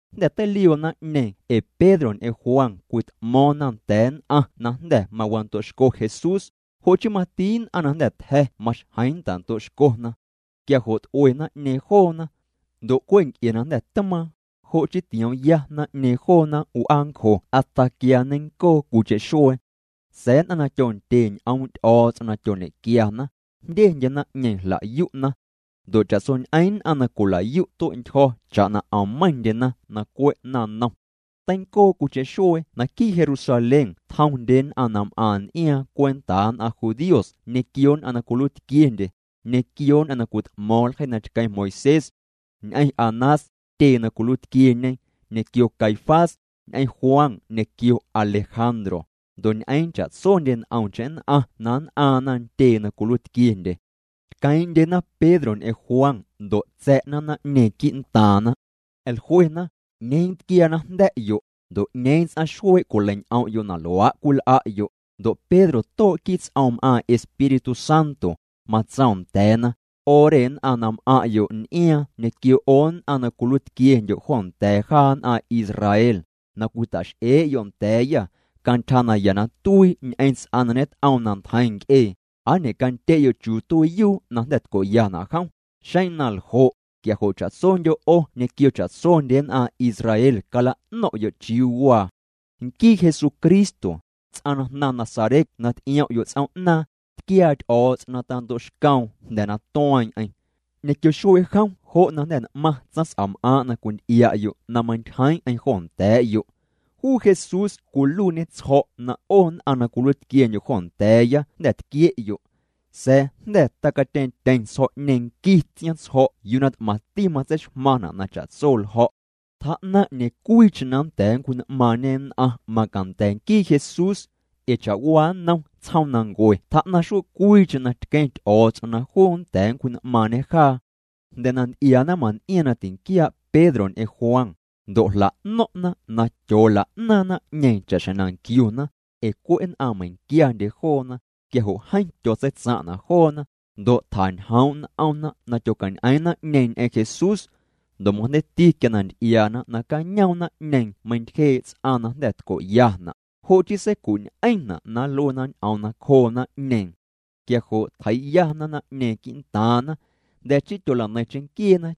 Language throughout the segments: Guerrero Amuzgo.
Jnda̱ teilioo naⁿ'ñeeⁿ ee Pedro ñ'eⁿ Juan cwit'mo̱o̱ⁿna nda̱a̱ nn'aⁿ na jnda̱ mawando'xco Jesús, jo' chii mati nn'aⁿ na jnda̱ tja̱ maxjeⁿ ntando'xcona. Quia jo' t'ue naⁿ'ñeeⁿ joona. Ndo' cwe' nc'e na jnda̱ tmaaⁿ, jo' chii tioomya naⁿ'ñeeⁿ joona w'aancjo hasta quia nneiⁿncoo cwiicheⁿ xuee. Sa̱a̱ nn'aⁿ na tyondye ñ'oom' Ty'o̱o̱ts'om na tyoñe'quiana, jndyendye naⁿ'ñeeⁿ jla'yu'na. Ndo' cha'tsoñ'eⁿ nn'aⁿ na cwila'yu' tue'ntyjo̱ cha'na 'om meiⁿndyena na cwe' naⁿnom. Teincoo cwiicheⁿ xuee naquii' Jerusalén tjomndye nn'aⁿ na m'aⁿ n'iaaⁿ cwentaa nn'aⁿ judíos ñequio nn'aⁿ na cwiluiitquiendye, ñequio nn'aⁿ na cwit'mo̱o̱ⁿ ljeii na tqueⁿ Moisés. Ñ'eⁿ Anás, tyee na cwiluiitquieñe, ñequio Caifás, ñ'eⁿ Juan ñequio Alejandro, ndo' ñ'eeⁿ cha'tsondye nt'omcheⁿ nn'aⁿ na nn'aaⁿna ntyee na cwiluiitquiendye. Tqueeⁿ'ndyena Pedro ñ'eⁿ Juan ndo' tsa̱'na naⁿ'ñeeⁿ quii'ntaaⁿna. Jluena: —¿'Ñeeⁿ tquiaa na jnda̱'yo', ndo' 'ñeeⁿ ts'aⁿ xuee' cwilei'ñ'om'yo' na luaa' cwil'a'yo'? Ndo' Pedro too' quii' ts'oom m'aaⁿ Espíritu Santo, matsoom nda̱a̱na: —'O re nn'aⁿ na m'aⁿ'yo' n'iaaⁿ ñequio 'o nn'aⁿ na cwiluiitquiendyo' joo nda̱a̱ jaa nn'aⁿ Israel, na cwita'x'ee'yo' nda̱a̱yâ cantyja naya na tuii ñ'eⁿ ts'aⁿ na ñet'oom na ntjeiⁿ nc'ee, ¿aa ñe'candye'yo' chiuu tuiiyuu na jnda̱ tco'yana' jom? Xeⁿ na ljo', quia jo' cha'tsondyo' 'o ñequio cha'tsondye nn'aⁿ Israel cala'no̱ⁿ'yo' chiuu waa. Nquii Jesucristo, ts'aⁿ na jnaⁿ Nazaret na ty'iom'yo' ts'oom'naaⁿ, tquiaa Ty'o̱o̱ts'om na tando'xcoom jnda̱ na tueeⁿ'eⁿ. Ñequio xuee' jom jo' na jnda̱ n'maⁿ tsaⁿs'am'aaⁿ' na cwinty'ia'yo' na meintyjeeⁿ'eⁿ jo nda̱a̱'yo'. Juu Jesús cwiluiine tsjo̱' na 'o na cwiluiitquiendyo' jo nda̱a̱ya jnda̱ tquie'yo'. Sa̱a̱ jnda̱ tacatyeeⁿtyeⁿ tsjo̱'ñeeⁿ nquii tsiaⁿtsjo̱' yuu na t'maⁿti matseixmaⁿna' na cha'tso ljo̱'. Tjaa'naⁿ 'ñeeⁿ cwiicheⁿ na nnda̱a̱ nncwji'n'maaⁿñe nn'aⁿ macanda̱ nquii Jesús. Ee cha'waa nnom tsjoomnancue tjaa'naⁿ xuee' cwiicheⁿ na tqueⁿ Ty'o̱o̱ts'om na juu nnda̱a̱ nncwji'n'maaⁿñe jaa. Jnda̱ na nty'iaa naⁿmaⁿn'iaaⁿ na tinquiaa' Pedro ñ'eⁿ Juan, ndo' jla'no̱ⁿ'na na tyoola'naaⁿ naⁿ'ñeeⁿ cha'xjeⁿ na nquiuna, ee cwe' nn'aⁿ meiⁿquiandye joona, quia jo' jeeⁿ tyotseitsaⁿ'na' joona, ndo' tjañjoom' n'omna na tyocañ'eeⁿ naⁿ'ñeeⁿ ñ'eⁿ Jesús. Ndo' majndeiiti quia na nty'iaana nacañoom naⁿ'ñeeⁿ meintyjee' ts'aⁿ na jnda̱ tco'yana', jo' chii seicu'ñ'eⁿna' na nluena ñ'oom nacjoo naⁿ'ñeeⁿ. Quia jo' tjeii'yana naⁿ'ñeeⁿ quii'ntaaⁿna. Jnda̱ chii tyola'neiⁿ cheⁿnquieena.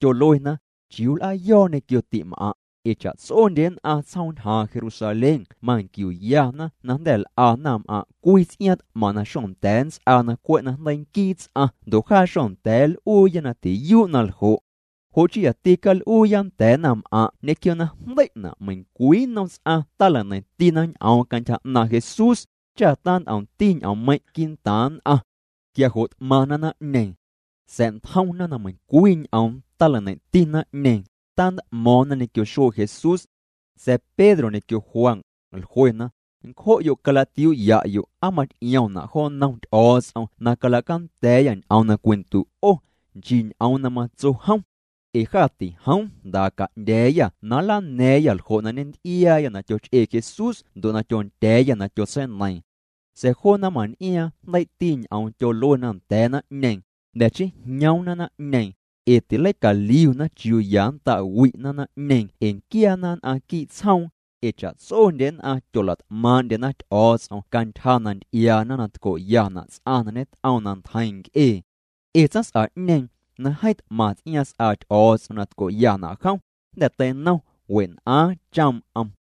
Tyoluena: —¿Chiuu nl'aayo̱o̱ ñequio ti'm'aⁿ'? Ee cha'tsondye nn'aⁿ tsjoom ñjaaⁿ Jerusalén manquiuyana na jnda̱ l'a naⁿm'aⁿ' cwii ts'iaaⁿ t'maⁿ na xocanda̱a̱ nnts'aa na cwe' na jndeii nquii ts'aⁿ ndo' jaa xonda̱a̱ nl'uuya na tiyuu' na ljo'. Jo' chii yati cal'uuya nda̱a̱ naⁿm'aⁿ' ñequio na jndei'na' meiⁿcwii nnom ts'aⁿ tala'neiⁿtina ñ'oom cantyja 'naaⁿ' Jesús, cha tant'omti ñ'oommeiⁿ' quii'ntaaⁿ nn'aⁿ. Quia jo' t'maⁿna naⁿ'ñeeⁿ. Sa̱'ntjomna na meiⁿcwii ñ'oom tala'neiⁿti naⁿ'ñeeⁿ, tant'mo̱o̱ⁿna ñequio xuee' Jesús. Sa̱a̱ Pedro ñequio Juan, jluena: —Ncjo'yo' calatiuu'ya'yo' aa maty'iomna' jo nnom Ty'o̱o̱ts'om na calacanda̱a̱yâ ñ'oom na cwindu' 'o, nchii ñ'oom na matso jom. Ee jâ tijoom jndaa ca'ndya̱a̱yâ na nlana̱a̱ⁿyâ ljo' na ñenty'iaayâ na tyoch'ee Jesús ndo' na tyondya̱a̱yâ na tyotseineiiⁿ. Sa̱a̱ joo naⁿmaⁿn'iaaⁿ jndeii'ti ñ'oom tyoluena nda̱a̱ naⁿ'ñeeⁿ. Jnda̱ chii jñoomna naⁿ'ñeeⁿ, ee tileicaliuna chiuu ya nnta'wi'na naⁿ'ñeeⁿ ee nquiaana nn'aⁿ quii' tsjoom, ee cha'tsondye nn'aⁿ tyolat'maaⁿ'ndyena Ty'o̱o̱ts'om cantyja na nty'iaana na tco'yana' ts'aⁿ na ñet'oom na ntjeiⁿ nc'ee. Ee tsaⁿs'a'ñeeⁿ, na jeeⁿ t'maⁿ ts'iaaⁿ s'aa Ty'o̱o̱ts'om na tco'yana' jom, jnda̱ teinom wen'aaⁿ choom'm.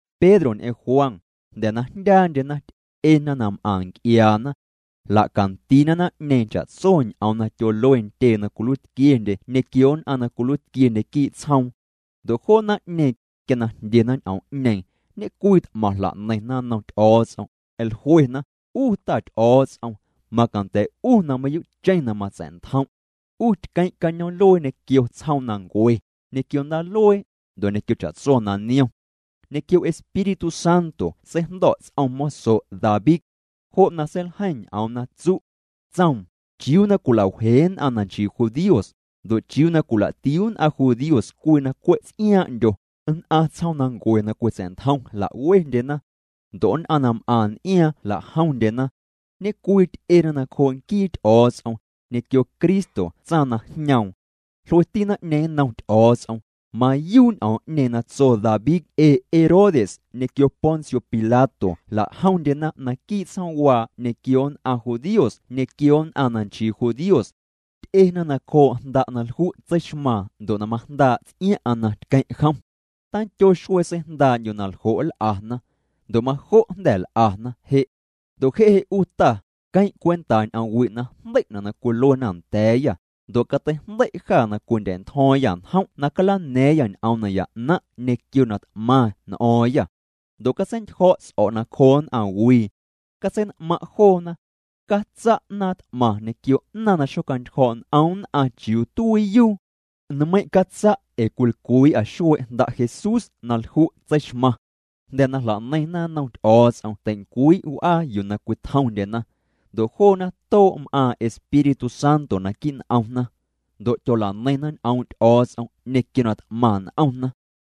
Pedro ñ'eⁿ Juan, jnda̱ na jndyaandyena, ty'ena na m'aⁿ nc'iaana. Jla'candiina naⁿ'ñeeⁿ cha'tso ñ'oom na tyolue ntyee na cwiluiitquiendye ñequio nn'aⁿ na cwiluiitquiendye quii' tsjoom. Ndo' joo naⁿ'ñeeⁿ, quia na jndyena ñ'oom'ñeeⁿ, ñe'cwii t'maⁿ jla'neiⁿna nnom Ty'o̱o̱ts'om, jluena: —'U Ta Ty'o̱o̱ts'om, macanda̱ 'U na mayuu'cheⁿ na matsa̱'ntjom'. 'U tqueⁿ' cañoom'luee ñequio tsjoomnancue, ñequio ndaaluee, ndo' ñequio cha'tso na niom. Ñequio Espíritu Santo seijndo̱' ts'om moso' David. Jo' na seiljeiⁿ ñ'oom na tsu'. Tsoom: ¿Chiuu na cwila'wjee nn'aⁿ na nchii judíos? Ndo' ¿chiuu na cwila'tiuu nn'aⁿ judíos cwii na cwe' ts'iaaⁿ'ndyo? Nn'aⁿ tsjoomnancue na cwitsa̱'ntjom jla'wendyena. Ndo' nn'aⁿ na m'aⁿ n'iaaⁿ jla'jomndyena. Ñe'cwii ty'ena nacjoo' nquii Ty'o̱o̱ts'om, ñequio Cristo tsaⁿ na jñoom. Jlueti naⁿ'ñeeⁿ nnom Ty'o̱o̱ts'om: —Mayuu' ñ'oom'ñeeⁿ na tso David ee Herodes ñequio Poncio Pilato jla'jomndyena naquii' tsjoomwaa ñequio nn'aⁿ judíos ñequio nn'aⁿ na nchii judíos. Ty'ena nacjoo' Jnda' na lju' tseixmaaⁿ ndo' na majndaa' ts'iaⁿ'aⁿ na tqueⁿ' jom. Tandyo xuee seijndaa'ndyu' ljo' nl'ana. Ndo' majo' jnda̱ l'ana je'. Ndo' je' je' 'u Ta, queⁿ' cwenta ñ'oom wi' na jndei'na' na cwiluena nda̱a̱yâ, ndo' cateijndei' jâ na cwindya̱'ntjo̱o̱ⁿyâ njom' na calana̱a̱ⁿyâ ñ'oom naya 'naⁿ' ñequio na t'maⁿ n'o̱o̱ⁿyâ. Ndo' catseintyjo̱' ts'o̱' nacjoo nn'aⁿwii. Catsein'maⁿ' joona. Catsa' 'naaⁿ t'maⁿ ñequio 'naaⁿ na xocjaantyjo̱o̱' n'om nn'aⁿ chiuu tuiiyuu. Nmeiⁿ' catsa' ee cwilcwii'â xuee' Jnda' Jesús na lju' tseixmaⁿ. Jnda̱ na jla'neiⁿna nnom Ty'o̱o̱ts'om tei'ncwii' w'aa yuu na cwitjomndyena. Ndo' joona too' m'aaⁿ Espíritu Santo naquii' n'omna. Ndo' tyola'neiⁿna ñ'oom' Ty'o̱o̱ts'om ñequio na t'maⁿ n'omna.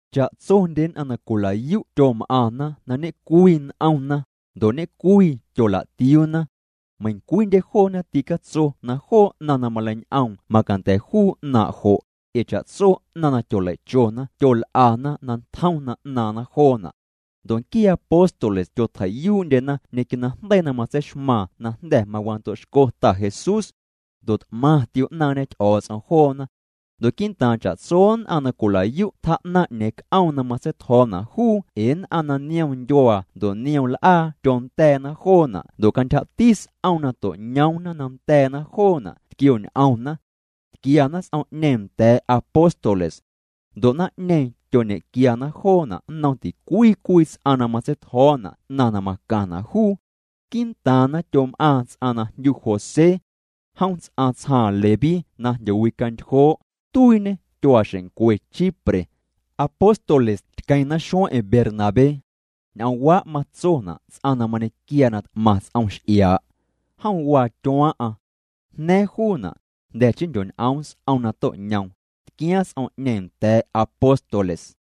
Cha'tsondye nn'aⁿ na cwila'yu' tyom'aⁿna na ñe'cwii n'omna, ndo' ñe'cwii tyola'tiuuna. Meiⁿcwiindye joona ticatso na joo 'naⁿ na maleiñ'oom macanda̱ juu 'naaⁿ' jo', ee cha'tso 'naⁿ na tyoleichona tyol'ana na tjom na 'naaⁿna joona'. Ndo' nquiee apóstoles tyotjeii'yuu'ndyena ñequio najndeii na matseixmaaⁿ na jnda̱ mawando'xco Ta Jesús. Ndo' t'maⁿ tio'naaⁿñe Ty'o̱o̱ts'om joona. Ndo' quii'ntaaⁿ cha'tso nn'aⁿ na cwila'yu' tjaa'naⁿ 'ñeeⁿ c'oom na matseitjo̱o̱na' juu ee nn'aⁿ na niom ndyuaa ndo' niom l'aa tyonda̱a̱na joona' ndo' cantyjati s'om na to'ñoomna na nda̱a̱na joona' tquioñ'omna. Tquiana s'om'ñeeⁿ nda̱a̱ apóstoles. Ndo' naⁿ'ñeeⁿ tyoñequiana joona' nnom ticwii cwii ts'aⁿ na matseitjo̱o̱na' 'naⁿ na macaⁿna' juu. Quii'ntaaⁿna tyom'aaⁿ ts'aⁿ na jndyu José. Jom ts'aⁿ tsjaaⁿ Leví na jndyowicantyjoo', tuiiñê tyuaaxeⁿncwe Chipre. Apóstoles tqueⁿna xueeⁿ'eⁿ Bernabé. Ñ'oomwaa' matsona' ts'aⁿ na mañequiaa na t'maⁿ ts'om x'iaa'. Jom waa tyuaaⁿ'aⁿ. Jna̱a̱ⁿ juuna', jnda̱ chii jndyoñ'oom s'om na to'ñoom, tquiaaⁿ s'om'ñeeⁿ nda̱a̱ apóstoles.